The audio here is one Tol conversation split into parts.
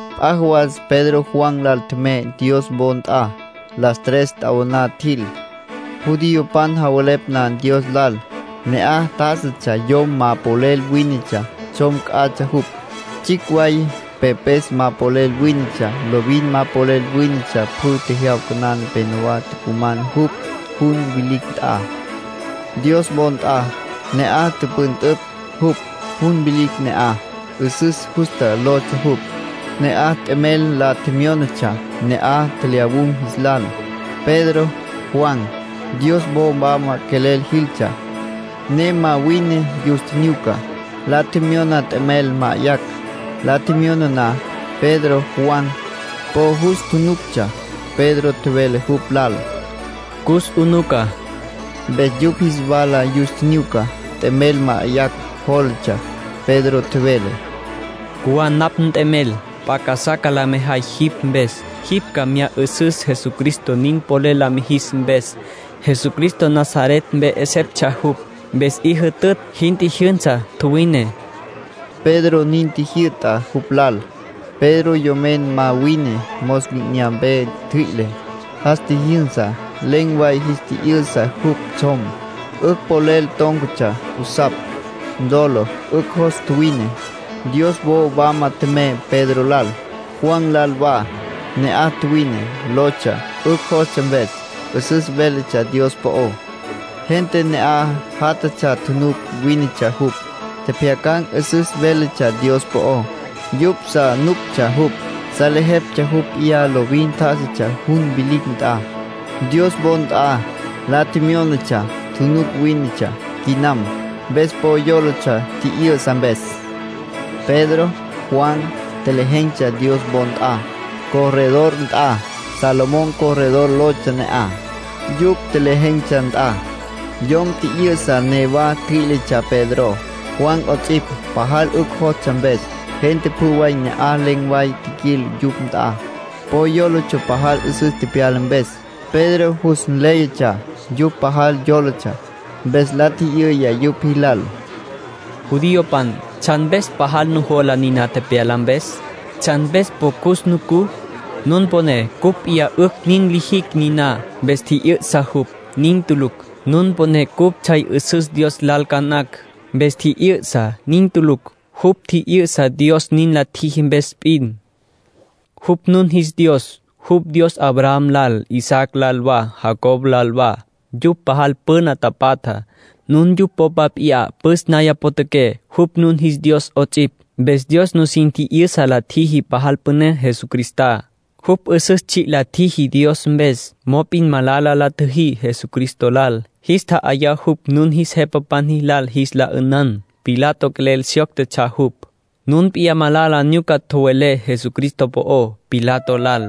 P'a jawas Pedro Juan lal tjemey Dios wo nt'a. Las tres t'awaná tjil, judiopan javelepj na Dios lal. Ne'aj tjá'asatsja yom ma polel wínetsja. Tsjom c'atsja jupj. Tsjicj way pepes ma polel wínetsja. Lovin ma polel wínetsja. Pjü jyawca na nepenowá tucuman jupj jun vilicj nt'a, Dios wo nt'a. Ne'aj tüpüntüpj jupj. Jun vilicj ne'aj “'Üsüs Justa” lotsja jupj. Ne'aj t'emel la tjemyónatsja ne'aj tjelyawun̈ jis lal. Pedro, Juan, Dios wo wama quelel jiltsja, ne ma wine yus tjinyuca. La tjemyona t'emel ma'ayacj. La tjemyona na, Pedro, Juan, po jus tjunuctsja. Pedro tjevele jupj lal: —Cus 'unuca. Mpes yupj jis wala yus tjinyuca. T'emel ma'ayacj jólatsja. Pedro tjevele: —Cjuwá napj nt'emel. P'a casá ca la mejay jipj mpes. Jipj ca mya 'ü'süs Jesucristo nin polel la mijis mpes, Jesucristo Nazaret mpe 'eseptsja jupj. Mpes 'i jütütj, jin tjijyünsa, tjuwine —Pedro nin tjijyü'ta jupj lal. Pedro yomen ma wine mos li'inyampe ntjüi'le, jas tjijyünsa. Len̈ way jis tji'yü'sa jupj tsjom. 'Ücj polel tón̈catsja jusapj. Ntolo, 'ücj jos tjuwine. Dios wo wama tjemey Pedro lal, Juan lal wa. Ne'aj tjuwine, tólotsja, 'ücj jostsja mpes. 'Üsüs véletsja Dios po'ó. Gente ne'aj játjatsja tjunuc wínetsja jupj, tjepjyacan̈ 'üsüs véletsja Dios po'ó. Yupj sa nuctsja jupj. Salejeptsja jupj p'iyá lovin tjá'asatsja jun vilicj nt'a, Dios wo nt'a, la tjemyónatsja. Tjunuc wínetsja quinam, mpes po yólatsja tji'yü'sa mpes. Pedro, Juan, tjelejen̈tsja Dios wo nt'a, corredor nt'a. Salomón Corredor lotsja ne'aj, yupj tjelejen̈tsja nt'a. Yom tji'yü'sa newa ntjüí'letsja Pedro, Juan 'ots'ipj, pajal 'ücj jostsja mpes. Gente pjü way ne'aj len̈ way tjiquil yupj nt'a. Po yólatsja pajal 'üsüs tepyala mpes. Pedro jus nléyatsja yupj pajal yólatsja, mpes la tji'yüya yupj jilal: “Judiopan, ¿tsjan mpes pajal nujola niná tepyala mpes? ¿Tsjan mpes po cus nucú? Nun poné cupj p'iyá 'ücj nin lijicj niná, mpes tji'yü'sa jupj. Nin tulucj. Nun poné cupj tsjay 'üsüs Dios lal ca nacj, mpes tji'yü'sa. Nin tulucj. Jupj tji'yü'sa Dios nin la tjiji mpes p'in. Jupj nun jis Dios. Jupj Dios Abraham lal, Isaac lal wa, Jacob lal wa. Yupj pajal püna tapatja, nun yupj popa p'iyá püs naya potjaqué. Jupj nun jis Dios 'ots'ipj. Mpes Dios nusin tji'yüsa la tjiji pajal püné Jesucristá; jupj 'üsüs tsji' la tjiji Dios mpes. ”Mop'in malala la tjüjí Jesucristo lal. Jis tja'ayá jupj nun jis jepapan jilal jis la 'ünan. Pilato quelel syóctetsja jupj; nun p'iyá malala nyuca tjowelé Jesucristo po'ó Pilato lal.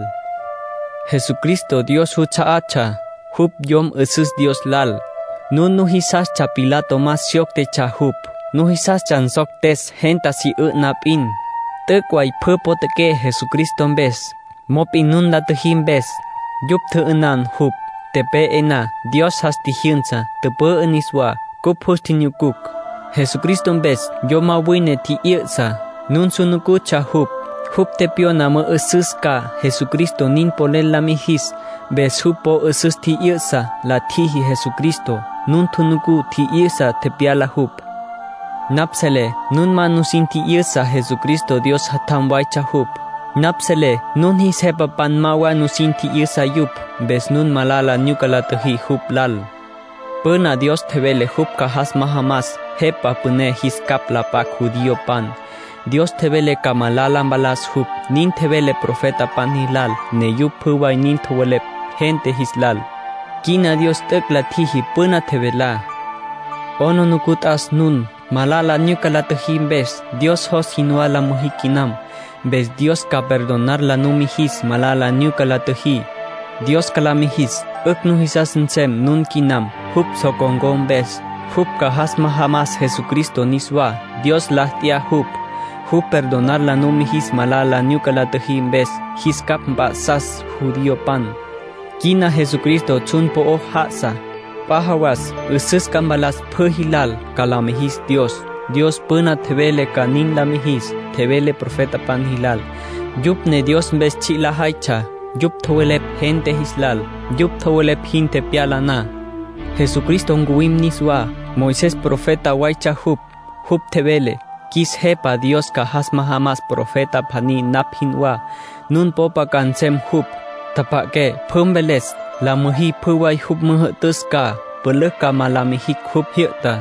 Jesucristo Dios juts'a'atsja, jupj Yom 'Üsüs Dios Lal. Nun nujisastsja Pilato ma syóctetsja jupj. Nujisastsja nsoctes gente si 'ü'na p'in. T'üc' way pjü potjaqué Jesucristo mpes. Pero nun la tjüjí mpes, yupj tjü'ünan jupj. Tepe'e na, Dios jas tjijyünsa, tüpü'ü niswá. Cupj jus tjinyucucj. Jesucristo mpes yom ma wine tji'yü'sa. Nun su nucutsja jupj. Jupj tepyona mü'ü'süs ca, Jesucristo nin polel la mijis. Mpes jupj po 'üsüs tji'yü'sa, la tjiji Jesucristo. Nun nucú tji'yü'sa tepyala jupj. ”Napj selé nun ma nusin tji'yüsa Jesucristo Dios Jatjam waytsja jupj. Napj selé nun jis jepapan ma wa sin tji'yüsa yupj. Mpes nun malala nyuca la tjüjí jupj lal. Püna Dios tjevele jupj ca jas majamas Jepa Püné jis capj la p'acj judiopan; Dios tjevele ca malala mpalas jupj. Nin tjevele profetapan jilal, ne yupj pjü way nin tjowelepj gente jis lal. Quina Dios t'üc' la tjiji püná tjevelá. 'Aplijila t'as nun, malala nyuca la tjüjí mpes. Dios jos jinwá la müjí quinam. Mpes Dios ca perdonar la numijis malala nyuca la tjüjí. Dios ca la mijis 'ücj nujisas nsem nun quinam, jupj so con̈có mpes. Jupj ca jas majamas Jesucristo niswá. Dios la t'ya jupj. Jupj perdonar la numijis malala nyuca la tjüjí mpes. Jis capj mp'a'sas judiopan. Quina Jesucristo tsjun po'o já'asa. P'a jawas 'üsüs ca mpalas pjü jilal, ca la mijis Dios. Dios püna tjevele ca nin la mijis. Tjevele profetapan jilal, yupj ne Dios mpes tsji' lajaytsja. Yupj tjowelepj gente jis lal. Yupj tjowelepj jin tepyala na, Jesucristo ncuwim niswá. ”Moisés profeta waytsja jupj. Jupj tjevele: ‘Qjuis Jepa Dios ca jas majamas profeta pjaní napj jinwá. Nun popa ca nsem jupj. Tjapja'aqué pjü mveles. La müjí pjü way jupj müjü'tüs ca. Pülücj ma ca la mijicj jupj jyü'tá.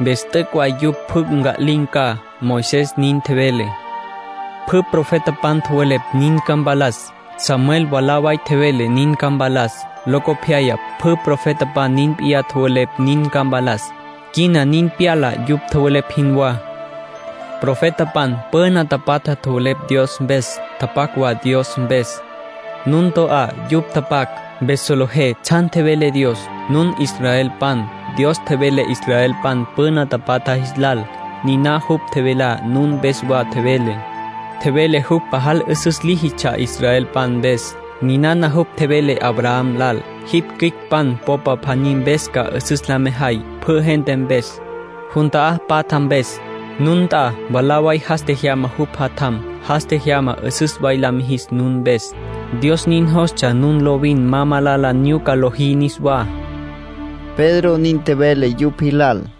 Mpes t'üc' way yupj pjü nca'lin̈ ca.’ Moisés nin tjevele. ”Pjü profetapan tjowelepj nin ca mpalas. Samuel mwalá way tjevele nin ca mpalas, locopyaya pjü profetapan nin p'iyá tjowelepj nin ca mpalas. Quina nin pyala yupj tjowelepj jinwá. ”Profetapan püna tapatja tjowelepj Dios mpes, tapac wa Dios mpes. Nun to'á yupj tapac, mpes solejé tsjan tjevele Dios. Nun israelpan. Dios tjevele israelpan püna tapatja jis lal. Niná jupj tjevelá nun mpes wa tjevele. Tjevele jupj pajal 'üsüs líjitsja israelpan mpes. Ninana jupj tjevele Abraham lal: ‘Jipj cüicpan popa pjaní mpes ca 'üsüs la mejay pjü gente mpes, jun ta'á patja mpes’. Nun nt'a mwalá way jas tjejyama jupj Jatjam. Jas tjejyama 'üsüs way la mijis nun mpes. Dios nin jostsja nun lovin ma malala nyuca lojí niswá”, Pedro nin tjevele yupj jilal.